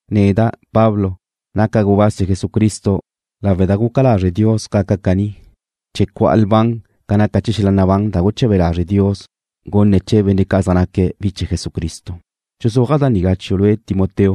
Neda', Pablo, naca' gubáz chee̱ Jesucristo lawe' da guca lazre' Dios gaca' caní, chee̱ cu'a lban ca naca xel-la nabán da guche̱be lazre' Dios gunne̱' chee̱ benne' ca' zaj naque̱' bi chee̱ Jesucristo. Dxuzúaja' da nigá chiu' lue' Timoteo,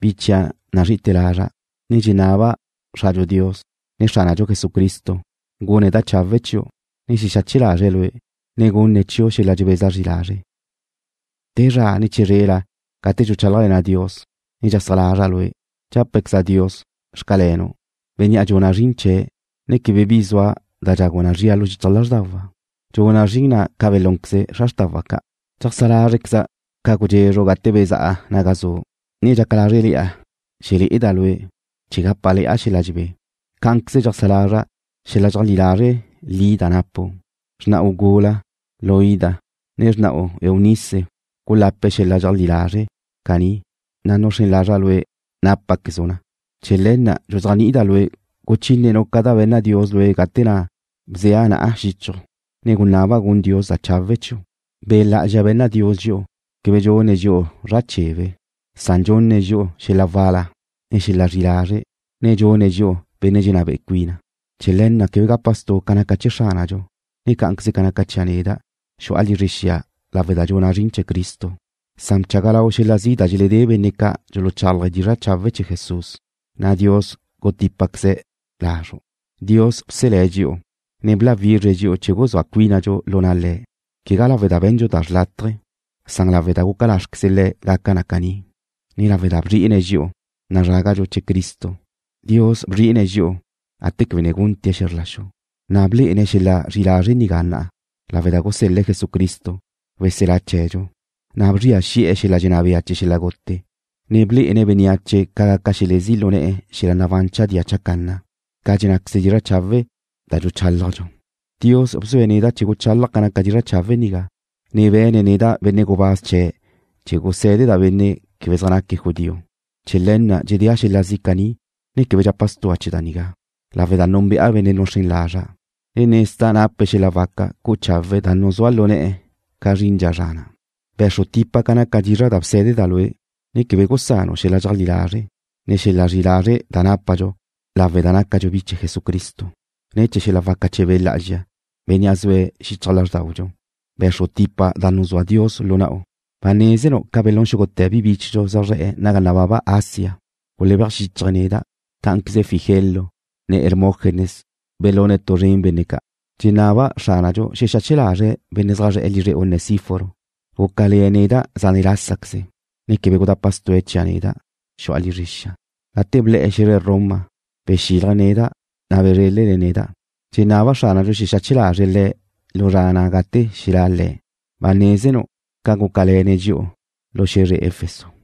bi chia' nazrí'i lazra', na' dxenaba' Xradxu Dios, ne Xránadxu Jesucristo gune̱' da chawe' chiu', ne xexache lazre̱' lue', ne gunne̱' chiu' xel-la dxebeza zri lazre'. Te zra ne chizrela gate dxuchálajle̱na' Dios, ne dxeajsá lazra' lue', dxápequeza' Dios: Xcalenu', Bénnea' dxuna' zrin chee̱', ne quebe bi zua da dxagu na zria lu xichaj lázrdawa'. Dxuna' zrin na' ca belúnqueze xra xrtawa' ca'. Dxeajsá lázrqueza' ca gudxezru' gate na' bezá'a naga zu', ne dxaca lázrele̱'a xelé'eda' lue' chee̱ gápale̱'a xel-la dxebé. Cá'anqueze dxeajsá lazra' xel-la dxeajlí lazre' li da napu'. Xrna'u gula, Loida, ne xrna'u, Eunice gulape̱' xel-la dxeajlí lazre' caní, na' nuxrén lazra' lue' nápaquezu' na. Chee̱ le̱ na' dxuzéajni'ida' lue' guchínenu' ca da be̱nna Dios lue' gate na' bzea' na'a xichju', ne gunaba' gun Dios da chawe' chiu'. Be' Lá'azxa be̱nna Dios dxi'u quebe dxune̱' dxi'u bi zra chebe, san dxunne̱' dxi'u xel-la wal-la, ne xel-la zri'i lazre', ne dxune̱' dxi'u benne' dxenná be'e cuina. Chee̱ le̱ na' quebe gapa stu' ca naca chee̱ Xránadxu, ne cá'anqueze ca naca chia' neda', xu'a lizre xia nigá lawe' da dxuna' zrin chee̱ Cristo, san bchaga lau lue' xel-la zi' da dxeledé benne' ca' dxuluchálaje̱' dizra' chawe' chee̱ Jesús, na' Dios gutípaqueze̱' lazru'. Dios bselé̱' dxi'u, ne bláwizre̱' dxi'u chee̱ guzúa cuínadxu lu na' Le̱', quegá lawe' da be̱ndxu tu da xrlátaje, san lawe' da guca lázrequeze Le̱' gaca na caní, ne lawe' da bzri'ine̱' dxi'u, nazrágadxu chee̱ Cristo. Dios bzri'ine̱' dxi'u gate quebe ne gunte̱' xe̱zr la xu nigá, na' blé'ene̱' xel-la zri'i lazre' nigá na'a, lawe' da gusel-le̱' Jesucristo, weselá chee̱dxu, na' bzria xi'e̱ xel-la dxenná bea chee̱ xel-la gute, ne blé'ene̱' bénneache ca gaca xelezí' lu ne̱'e̱ xel-la nabán chadía chacanna, ca dxennáqueze dizra' chawe' da dxuchálajdxu. Dios bzue̱' neda' chee̱ guchálaja' ca naca dizra' chawe' nigá, ne be̱ne̱' neda' benne' gubáz chee̱' chee̱ gusé̱deda' benne' quebe zaj naque̱' judío. Chee̱ le̱ na' dxedéa' xel-la zi' caní. Quebe dxapa stu'a ne̱ chee̱ da nigá, lawe' da núnbe'a Bénnea' nuxrén lazra', ne nezda' nape̱' xel-la waca cu'u chawe̱' da nuzúa' lu ne̱'e̱ ca zrindxa zra na'. Be̱xru tipa ca naca dizra' da bsé̱deda' lue', ne quebe gusanu' xel-la dxeajlí lazre', ne xel-la zri'i lazre' da nápadxu lawe' da nácadxu bi chee̱ Jesucristo. Ne̱ chee̱ xel-la waca chee̱ Be' Lá'azxa, Bénnea' zue̱' xichaj lázrdaudxu, be̱xru tipa da na' nuzúa Dios lu na'u. Ba nézenu' ca belún xúgute̱ bi bíchedxu zaj zre̱'e̱ naga nababa Asia. Gulebéaj xíchaje̱' neda'. Cá'anqueze Figelo, ne Hermógenes belune̱' tu zren benne' ca'. Dxenaba' Xránadxu xexache lazre̱' benne' zaj zre̱'e̱ lizre Onesíforo. Gúcale̱ le̱' neda' zane' lásaqueze, ne quebe gudapa stue̱' chia' neda', xu'a lizre xia. Gate ble̱'e̱ xe̱zre Roma, bexílaje̱' neda', na' bezrélene̱' neda'. Dxenaba' Xránadxu xexache lazre̱' le̱' lu zra ná' gate xelá' Le̱'. Ba nézenu' ca gúcale̱le̱'e̱ne̱' dxi'u lu xe̱zre Efeso.